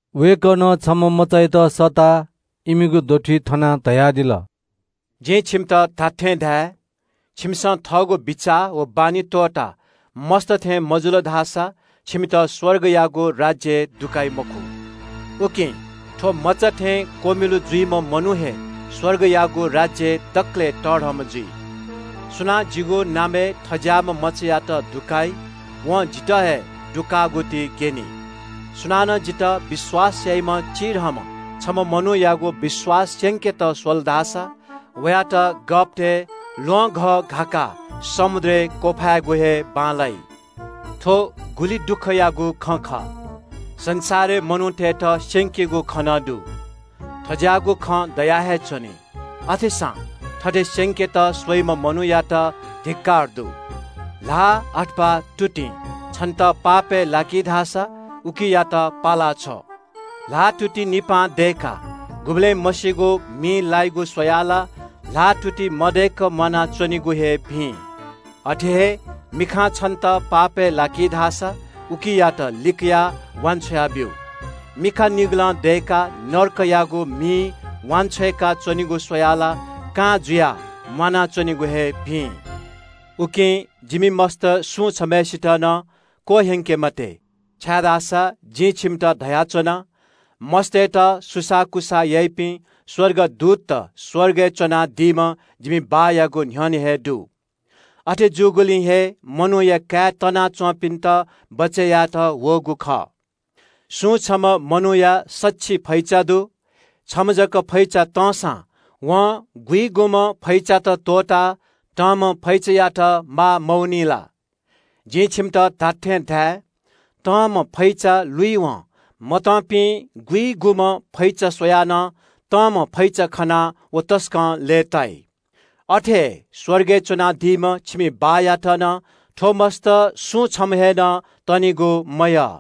वय्‌कलं छम्‍ह मचायात सःताः इमिगु दथुइ थनाः धयादिल – “जिं छिमित धात्‍थें धाये – छिमिसं थःगु बिचाः व बानी त्‍वःताः मस्‍त थें मजुल धाःसा छिमित स्‍वर्गयागु राज्‍यय् दुकाइ मखु। उकिं थ्‍व मचा थें क्‍वमिलु जुइम्‍ह मनू हे स्‍वर्गयागु राज्‍यय् दकलय् तःधंम्‍ह जुइ। “सुनां जिगु नामय् थज्‍याःम्‍ह मचायात दुकाइ, वं जितः हे दुकाःगु ति ग्‍यनी।” “सुनानं जितः विश्‍वास याइम्‍ह चिधंम्‍ह छम्‍ह मनूयात पापय् लाकेत स्‍वल धाःसा वयात गःपतय् ल्‍वहंघः घाकाः समुद्रय् क्‍वफायेगु हे बांलाइ। “थ्‍व गुलि दुःखयागु खँ खः – संसारय् मनूतय्‌त स्‍यंकीगु खँ नं दु। थज्‍याःगु खँ दया हे च्‍वनी। अथेसां थथे स्‍यंकेत स्‍वइम्‍ह मनूयात धिक्‍कार दु।” “ल्‍हाः अथवा तुतिं छन्‍त पापय् लाकी धाःसा उकियात पाला छ्व। ल्‍हाःतुति निपां दय्‌काः गुबलें मसीगु मिइ लायेगु स्‍वयाः ला ल्‍हाःतुति मदय्‌क म्‍वानाच्‍वनेगु हे भिं। अथे हे मिखां छन्‍त पापय् लाकी धाःसा उकियात लिकयाः वान्‍छ्वया ब्‍यु। मिखा निगलं दय्‌काः नरकयागु मिइ वांछ्वय्‌का च्‍वनेगु स्‍वयाः ला कां जुयाः म्‍वानाच्‍वनेगु हे भिं।” “उकिं जिमि मस्‍त सुं छम्‍हय्‌सित नं क्‍वह्यंके मते, छाय्‌धाःसा जिं छिमित धयाच्‍वना – मस्‍तय्‌त सुसाःकुसाः याइपिं स्‍वर्गदूतत स्‍वर्गय् च्‍वनादीम्‍ह जिमि बाःयागु न्‍ह्यःने हे दु। अथे जूगुलिं हे मनूया काय् तनाच्‍वंपिन्‍त बचय् यायेत वःगु खः। “छम्‍ह मनूया सछि फैचा दु। छम्‍ह जक फैचा तंसां वं गुइगुम्‍ह फैचात त्‍वःताः तंम्‍ह फैचायात माः मवनी ला? जिं छिमित खःगु खँ धाये – तंम्‍ह फैचा लुइवं मतंपिं गुइगुम्‍ह फैचा स्‍वयाः नं तंम्‍ह फैचा खनाः व तसकं लय्‌ताइ। अथे हे स्‍वर्गय् च्‍वनादीम्‍ह छिमि बाःयात नं थ्‍व मस्‍त सुं छम्‍ह हे नं तनिगु मयः।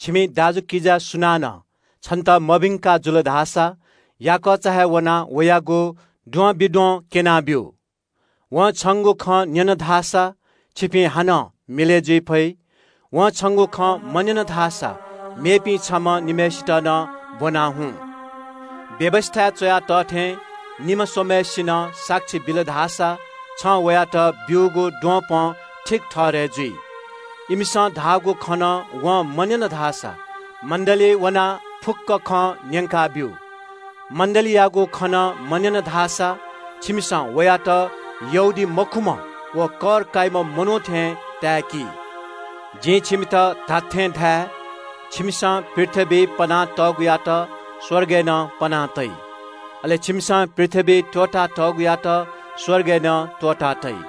“छिमि दाजुकिजा सुनानं छन्‍त मभिंका जुल धाःसा याकःचा हे वनाः वयागु द्वंबिद्वं क्‍यनाब्‍यु। वं छंगु खँ न्‍यन धाःसा छिपिं हानं मिलय् जुइ फइ। वं छंगु खँ मन्‍यन धाःसा मेपिं छम्‍ह निम्‍हय्‌सित नं ब्‍वनाः हुँ। व्‍यवस्‍थाय् च्‍वया तः थें निम्‍ह स्‍वम्‍हय्‌सिनं साक्षी बिल धाःसा छं वयात ब्‍यूगु द्वपं ठीक ठहरय् जुइ। इमिसं धाःगु खँ नं वं मन्‍यन धाःसा मण्‍डलीइ वनाः फुक्‍क खँ न्‍यंकाब्‍यु। मण्‍डलीयागु खँ नं मन्‍यन धाःसा छिमिसं वयात यहूदीमखुम्‍ह व कर काइम्‍ह मनू थें ताय्‌कि। “जिं छिमित खःगु खँ धाये – छिमिसं पृथ्‍वीइ पना तःगुयात स्‍वर्गय् नं पना तइ। अले छिमिसं पृथ्‍वीइ त्‍वःता तःगुयात स्‍वर्गय् नं त्‍वःता तइ।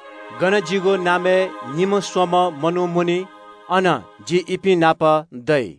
गन जिगु नामय् निम्‍ह स्‍वम्‍ह मनू मुनी, अन जि इपिं नाप दइ।”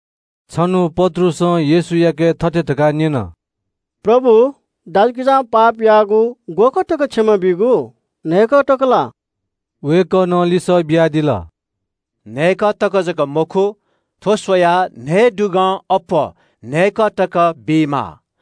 छन्‍हु पत्रुसं येशूयाके थथे धकाः न्‍यन – “प्रभु, दाजुकिजां पाप याःगु ग्‍वःकः तक क्षमा बीगु? न्‍हय्‌कः तक ला?” वय्‌कलं लिसः बियादिल – “न्‍हय्‌कः तक जक मखु। थ्‍व स्‍वयाः न्‍हयेदुगं अप्‍वः न्‍हय्‌कः तक बीमाः।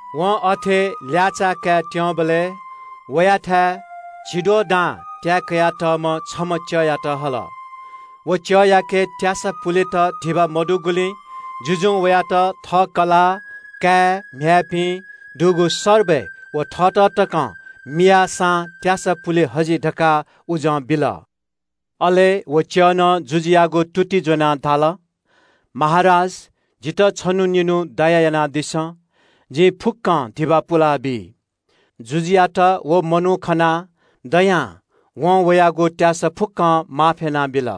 वं अथे ल्‍याःचाः काय् त्‍यंबलय् वयाथाय् झिद्वः दां त्‍याये कयातःम्‍ह छम्‍ह च्‍यःयात हल। व च्‍यःयाके त्‍यासा पुलेत धिबा मदुगुलिं जुजुं वयात थः कलाः, काय्‌म्‍ह्याय्‌पिं, दुगु सर्बय व थःत तकं मियाःसां त्‍यासा पुले हजि धकाः उजं बिल। “अले व च्‍यःनं जुजुयागु तुति ज्‍वनाः धाल – ‘महाराज, जितः छन्‍हु निन्‍हु दया यानादिसँ। जिं फुक्‍कं धिबा पुलाबी।’ जुजुयात व मनू खनाः दया वनाः वं वयागु त्‍यासा फुक्‍कं माफ यानाबिल।”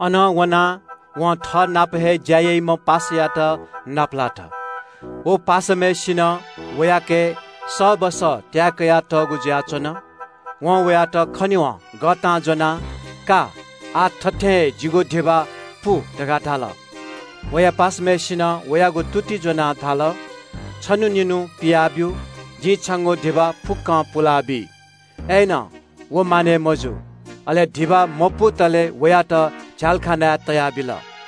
“अनं वनाः वं थःनाप हे ज्‍या याइम्‍ह छम्‍ह च्‍यःयात नापलात। व च्‍यःनं वयाके सःबस त्‍याये कयातःगु जुयाच्‍वन। वं वयात खनेवं गःतां ज्‍वनाः – ‘का, आः थथें हे जिगु धिबा पु’ धकाः धाल। “वया पासाम्‍हय्‌सिनं वयागु तुति ज्‍वनाः धाल – ‘छन्‍हु निन्‍हु पिया ब्‍यु। जिं छंगु धिबा फुक्‍कं पुलाबी।’ व मानय् मजू। अले धिबा मपुतले वयात झ्‍यालखानाय् तयाबिल।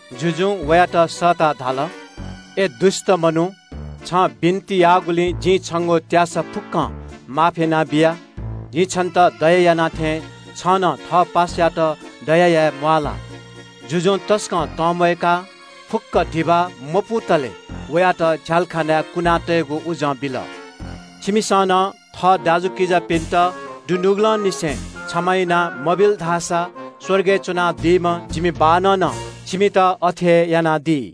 जुजुं वयात सःताः धाल – ‘अय् दुष्‍ट मनू, छं बिन्‍ति याःगुलिं जिं छंगु त्‍यासा फुक्‍कं माफ यानाबिया। जिं छन्‍त दया याना थें छं नं थःनापं ज्‍या याइम्‍ह च्‍यःयात दया याये म्‍वाः ला?’ जुजुं तसकं तंम्‍वयाः फुक्‍क धिबा मपुतले वयात झ्‍यालखानाय् कुना तयेगु उजं बिल।” “छिमिसं नं थः दाजुकिजापिन्‍त दुनुगलंनिसें क्षमा याना मबिल धाःसा स्‍वर्गय् च्‍वनादीम्‍ह जिमि बाःनं नं छिमित अथे हे यानादी।”